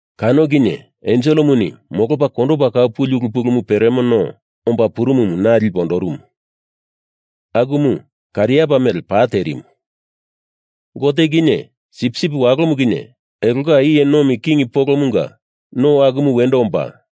Kano kinye enselemuni molopa kondopa kau puli ulu pulumu peremo no omba purumumu na lipe ondorumu, akumu kariapa mele pa terimu. Gote kinye Sipsip Walomu kinye elonga iye nomi king polomunga no akumu wendo omba,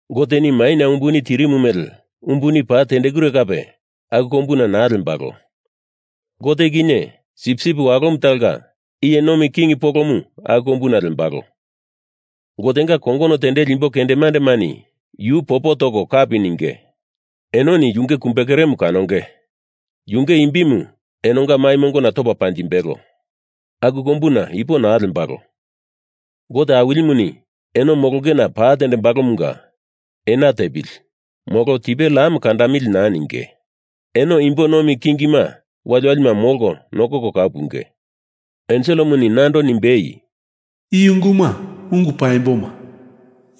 Goteni maina umbuni tirimu mele umbuni paa tendekure kape aku kombuna naa lembalo. Gote kinye Sipsip Walomu talonga iye nomi king polomu aku kombuna lembalo, Gotenga kongono tendeli imbo kendemandemani yu popo toko kapi ninge. Enoni yunge kumbekeremu kanonge, yunge imbimu enonga mai mongona topa panjimbelo. Aku kombuna ipo naa lembalo. Gote Awilimuni eno molongena pa tendembalomunga ena tepili, molo tipe lam kandamili naa ninge. Eno imbo nomi kingima waliwalima molko nokoko kau punge. Enselemuni nando nimbei, “I unguma ungu paimboma,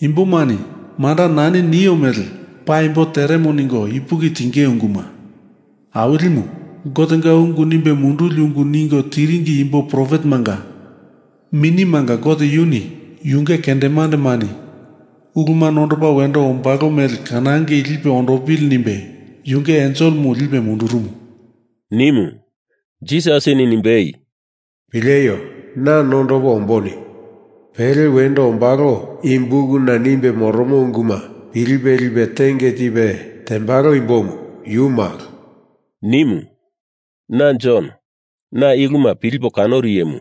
imbomani manda nani nio mele paimbo teremo ningo ipuki tinge unguma. Awilimu, Gotenga ungu nimbe munduli ungu ningo tiringi imbo profetemanga minimanga Gote, yuni yunge kendemandemani uluma nondopa wendo ombalo mele kanangei lipe ondopili nimbe yunge enselemu lipe mundurumu,” nimu. Jisasini nimbei, “Pileio! Na nondopo ombo nimu. Pele wendo ombalo i bukuna nimbe moromo unguma pilipe lipe tenge tipe tembalo imbomu yu malo,” nimu. Na Jon, na i uluma pilipo kanoru iyemu.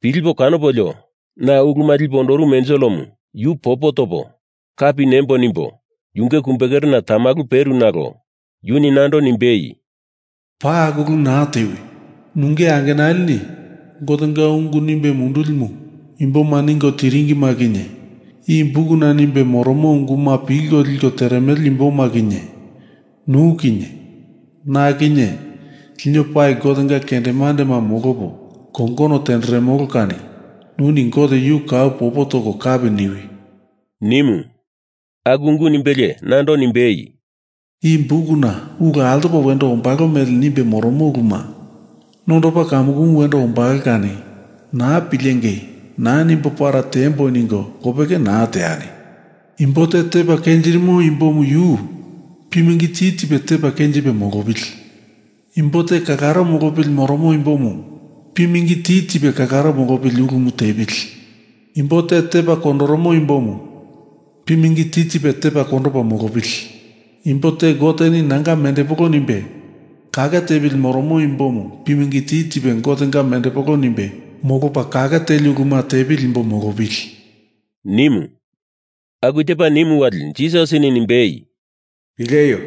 Pilipo kanopolio na uluma lipe ondorumu enselemu yu popo topo kapi nembo nimbo yunge kumbe kerena tamalu peru nalo yuni nando nimbei, “Paa aku ulu naa tewi! Nunge angenalini Gotenga ungu nimbe mundulimu imboma ningo tiringima kinye, i bukuna nimbe moromo unguma pilko liko teremele imboma kinye, nu kinye na kinye lino pali Gotenga kendemandema molopo kongono tenderemolo kani nuni Gote yu kau popo toko kapi niwi!” nimu. Aku ungu nimbelie nando nimbei, “I bukuna ulu altopa wendo ombalo mele nimbe moromo uluma nondopa kamukumu wendo ombalo kani naa pilengei naa nimbo para tiembo ningo lopeke naa teani! Imbo te tepa kenjirimo imbomu yu pimingi ti tipe tepa kenjipe molopili! Imbo te kalaro molopili moromo imbomu pimingi ti tipe kalaro mololi ulumu tepili! Imbo te tepa kondoromo imbomu pimingi ti tipe tepa kondopa molopili! Imbo te Goteni nanga mendepolo nimbe kake tepili moromo imbomu pimingi ti tipe Gotenga mendepolo nimbe molopa kake teli uluma tepili imbo molopili,” nimu. Aku tepa nimu wali Jisasini nimbei, “Pileio!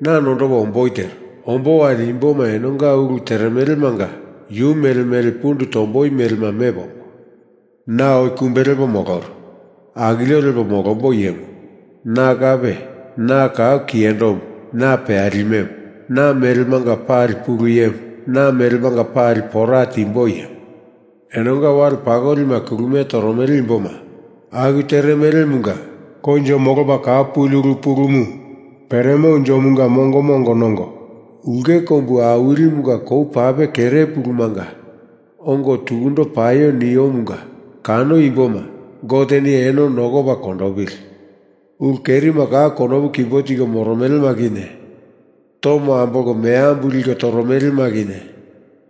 Na nondopo omboi tero. Ombo wali imboma enonga ulu teremelemanga yu mele mele pundu tomboi melema mepo ombo. Na oi kumbe lepo moloru. Akilio lepo molombo iyemu Na kape. Na kau kiyendomu, Na peyalimemu. Na melemanga pali Pulu Iyemu, Na melemanga pali pora timbo Iyemu. Enonga wale pakolima kulumie toromele imboma aku teremelemunga Koinjo Molopa Kau Puli Ulu Pulumu Peremo Unjomunga mongoma ongo nongo, ulke kombu awilimunga kou pape kere pulumanga ongo tukundo paio niomunga kano imboma, Goteni eno nokopa kondopili. Ulu kerima kau konopu kimbo tiko moromelema kinye, tomo ambolko meambu liko toromelema kinye,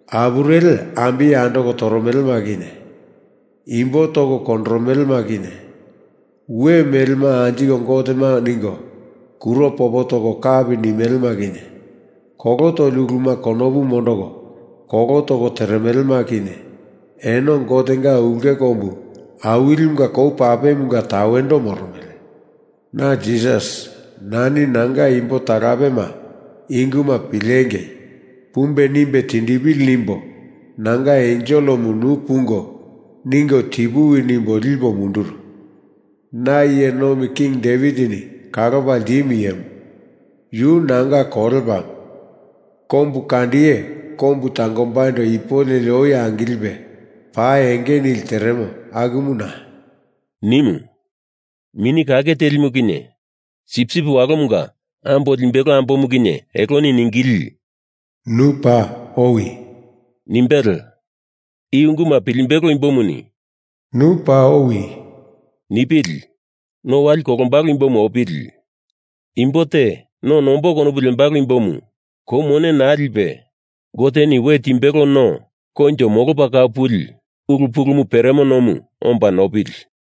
apureli ambiye andoko toromelema kinye, imbo toko kondoromelema kinye, we melema anjiko gotema ningo kuro popo toko kapi nimelema kinye, kolo toli uluma konopu mondoko kolo toko teremelema kinye eno Gotenga ulke kombu awilimunga kou papemunga tawendo moromele. Na Jisas, nani nanga imbo talapema i unguma pilengei, pumbe nimbe tindipili nimbo nanga enselemu nu pungo ningo tipuwi nimbo lipo munduru. Na iye nomi king Devitini kalopa ltimu Iyemu, yu nanga kolepamu. Kombu kandiye kombu tangombaindo ipu leli oi angilipe pa enge nili teremo akumu Na,” nimu. Mini Kake Telimu kinye Sipsip Walomunga Ambo Limbelo Ambomu kinye eloni ningili, “Nu paa owi!” nimbele. I unguma pilimbelo imbomuni “Nu paa owi!” nipili! No wali kolombalo imbomu opili! Imbo te no nombo konopu lembalo imbomu kou mone naa lipe Goteni we timbelo no koinjo molopa kau puli ulu pulumu peremo nomu, omba nopili!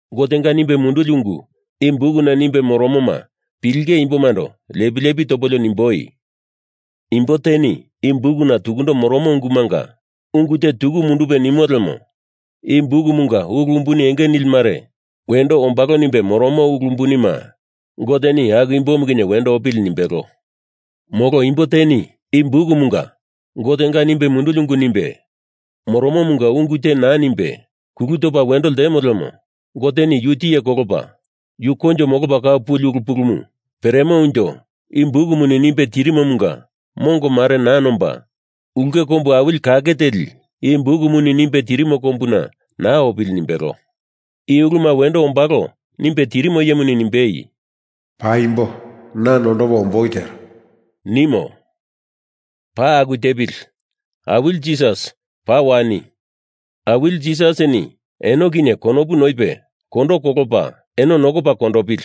Gotenga nimbe munduli ungu i bukuna nimbe moromoma pilinge imbomando lepi lepi topolio nimboi, “Imbo teni i bukuna tukundo moromo ungumanga ungu te tuku mundupe nimo lemo i bukumunga ulu umbuni enge nili mare wendo ombalo nimbe moromo ulu umbunima Goteni aku imbomu kinye wendo opili,” nimbelo. Molo imbo teni i bukumunga Gotenga nimbe munduli ungu nimbe moromomanga ungu te naa nimbe kulu topa wendo limo lemo Goteni yu tiye kolopa, yu koinjo molopa kau puli ulu pulumu peremo unjo i bukumuni nimbe tirimomunga mongo mare naa nomba, ulke kombu awili kake teli i bukumuni nimbe tirimo kombuna naa opili nimbelo. I uluma wendo ombalo nimbe tirimo iyemuni nimbei, “Paimbo. Na nondopo omboi tero,” nimo. Paa aku tepili! Awili Jisas, paa wani! Awili Jisasini eno kinye konopu noipe kondo kolopa eno nokopa kondopili.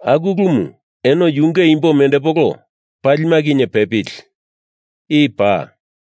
Aku ulumu eno yunge imbo mendepolo palima kinye pepili! I paa!